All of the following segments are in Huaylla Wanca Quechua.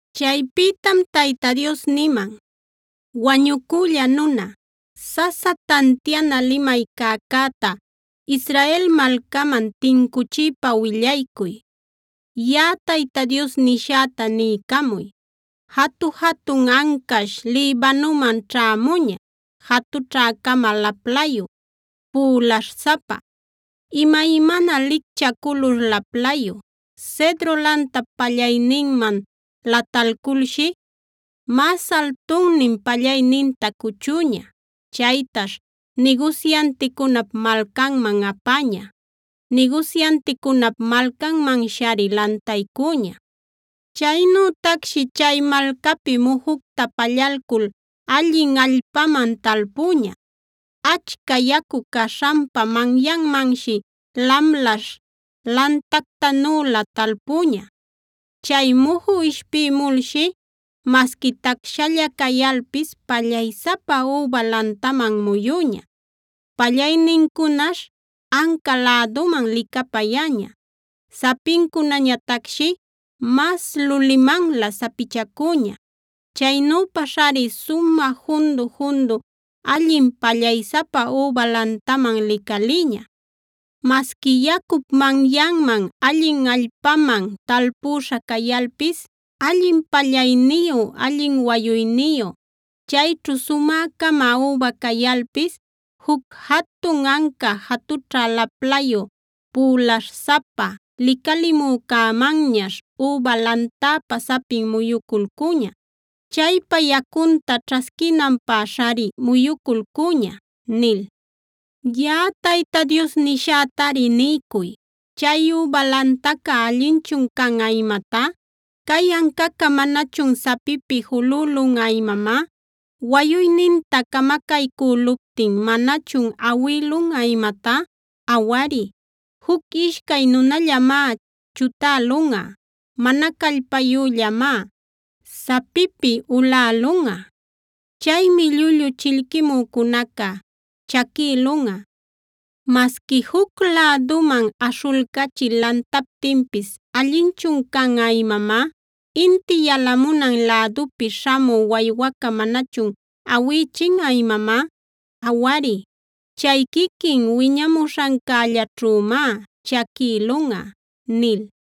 Chaypïtam Tayta Dios niman: “Wañucülla nuna, sasa tantiana limay cäcäta Israel malcaman tincuchiypa willaycuy. Yaꞌa Tayta Dios nishäta niycamuy: ‘Jatu-jatun ancash Libanoman ćhämuña, jatućhä-cama laplayu, pülasapa, imaymana licchä culur laplayu. Cedro lantap pallayninman latalculshi, mas altunnin pallayninta cuchüña. Chaytash nigusyanticunap malcanman apäña; nigusyanticunap malcanmanshari lantaycüña. “ ‘Chaynütacshi chay malcapi mujucta pallalcul allin allpaman talpüña. Achca yacu caśhanpa manyanmanshi lamlaśh lantactanülä talpüña. Chay muju ishpïmulshi masqui tacshalla cayalpis pallaysapa üba lantaman muyüña. Pallaynincunash anca läduman licapayäña; sapincunañatacshi mas lulimanlä sapichacüña. Chaynüpashari sumä jundu-jundu allin pallaysapa üba lantaman licalïña. “ ‘Masqui yacup manyanman, allin allpaman talpüśha cayalpis, allin pallayniyü, allin wayuyniyü, chayćhu sumä-cama üba cayalpis, juc jatun anca jatućha laplayü, pülaśh-sapa licalimücämanñash üba lantäpa sapin muyuculcuña. Chaypa yacunta ćhasquinanpäshari muyuculcuña’ nil. “Yaꞌa Tayta Dios nishätari niycuy: ‘¿Chay üba lantaca allinchun canꞌa imatá? ¿Cay ancaca manachun sapipi julülunꞌa imamá? ¿Wayuyninta camacaycüluptin manachun awïlunꞌa imatá? Awari, juc ishcay nunallamá chutälunꞌa; mana callpayüllamá sapipi ulälunꞌa. Chaymi llullu chillquimücunaca chaquïlunꞌa. Masqui ¿juc läduman aśhulcachil lantaptinpis allinchun canꞌa imamá? ¿Inti yalamunan lädupi śhamü waywaca manachun awïchinꞌa imamá? Awari, chay quiquin wiñamuśhancällaćhümá chaquïlunꞌa’” nil.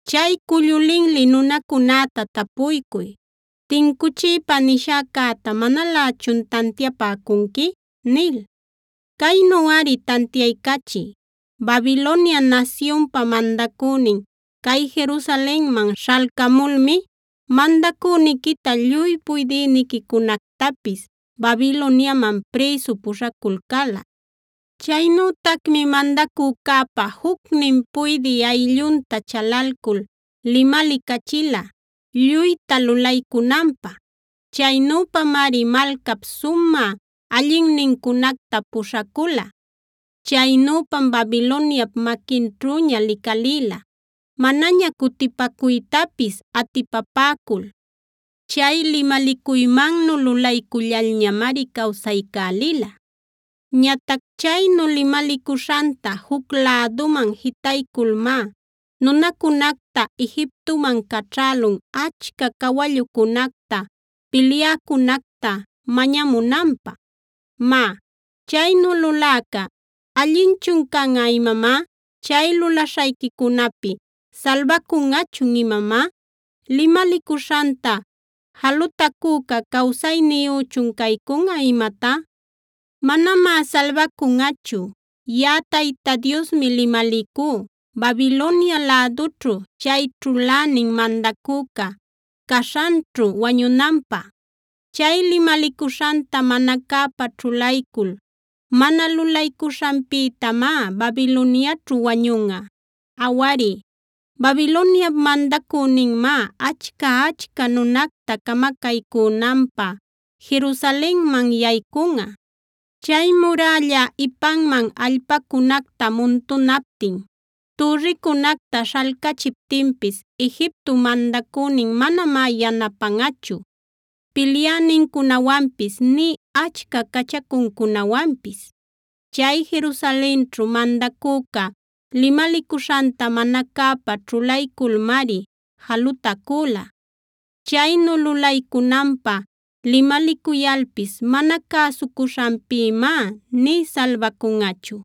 “Chay cullu linli nunacunäta tapuycuy ‘¿Tincuchiypa nishäcäta manalächun tantiapäcunqui?’ nil. Caynuꞌari tantiaycachiy: ‘Babilonia nasyunpa mandacünin cay Jerusalenman śhalcamulmi mandacüniquita, lluy puydïniquicunactapis Babiloniaman prïsu puśhaculcäla. Chaynütacmi mandacücäpa jucnin puydï ayllunta chalalcul limalicachila lluyta lulaycunanpä. Chaynüpamari malcap sumä allinnincunacta puśhacula. Chaynüpam Babiloniap maquinćhüña licalïla, manaña cutipacuytapis atipapäcul. Chay limalicuymannu lulaycullalñamari cawsaycälila. Ñatac chaynu limalicuśhanta juc läduman jitayculmá nunancunacta Egiptoman caćhälun achca cawallucunacta, pilyäcunacta mañamunanpä. Má, chaynu luläca, ¿allinchun canꞌa imamá? ¿Chay lulaśhancunapi salbacunꞌachun imamá? ¿Limalicuśhanta jalutacüca cawsayniyüchun caycunꞌa imatá? “ ‘Manamá salbacunꞌachu. Yaꞌa Tayta Diosmi limalicú, Babilonia lädućhu chay ćhulänin mandacüca caśhanćhu wañunanpä. Chay limalicuśhanta mana cäpa ćhulaycul mana lulaycuśhanpïtamá Babiloniaćhu wañunꞌa. Awari, Babiloniap mandacüninmá achca-achca nunacta camacaycünanpä Jerusalenman yaycunꞌa. Chay murälla ipanman allpacunacta muntunaptin, türricunacta śhalcachiptinpis Egiptop mandacünin manamá yanapanꞌachu pilyänincunawanpis nï achca cachacuncunawanpis. Chay Jerusalenćhu mandacüca limalicuśhanta mana cäpa ćhulayculmari jalutacüla. Chaynu lulaycunanpä limalicuyalpis mana cäsucuśhanpïmá nï salbacunꞌachu.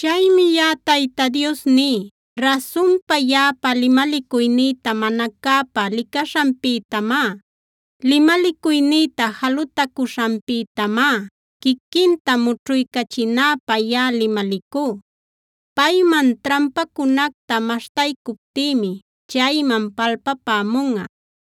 “ ‘Chaymi yaꞌa Tayta Dios ní: Rasunpa, yaꞌapa limalicuynïta mana cäpa licaśhanpïtamá, limalicuynïta jalutacuśhanpïtamá quiquinta mućhuycachinäpä yaꞌa limalicú. Payman trampäcunacta maśhtaycuptïmi chayman palpapämunꞌa.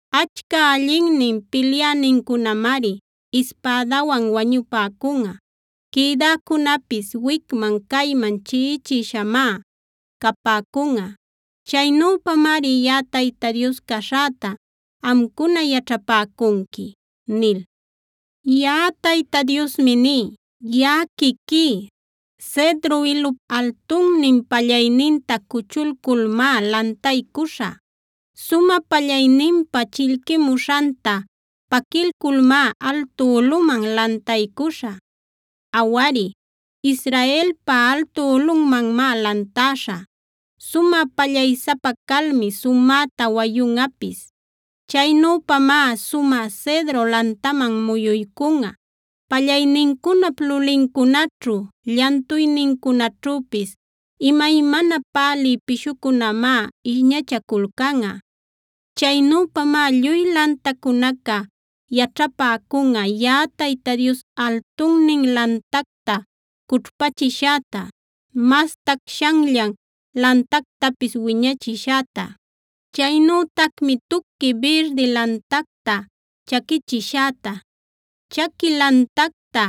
Achca allinnin pilyänincunamari ispädawan wañupäcunꞌa. Quïdäcunäpis wicman-cayman chiꞌichishamá capäcunꞌa. Chaynüpamari yaꞌa Tayta Dios caśhäta amcuna yaćhapäcunqui’ nil. “Yaꞌa Tayta Diosmi ní: ‘Yaꞌa quiquí, Cedro ilup altunnin pallayninta cuchulculmá lantaycuśhä. Sumä pallayninpa chillquimuśhanta paquilculmá altu ulꞌuman lantaycuśhä. Awari, Israelpa altu ulꞌunmanmá lantäśhä. Sumä pallaysapa calmi sumäta wayunꞌapis. Chaynüpamá sumä cedro lantaman muyuycunꞌa. Pallaynincunap lulincunaćhu, llantuynincunaćhüpis imaymana pälï pishucunamá ishñachaculcanꞌa. Chaynüpamá lluy lantacunaca yaćhapäcunꞌa yaꞌa Tayta Dios altunnin lantacta cućhpachishäta, mas tacshanllan lantactapis wiñachishäta. Chaynütacmi tuqui birdi lantacta chaquichishäta, chaqui lantacta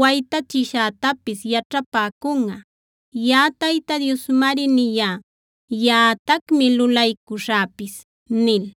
waytachishätapis yaćhapäcunꞌa. Yaꞌa Tayta Diosmari niyá; yaꞌatacmi lulaycuśhäpis’” nil.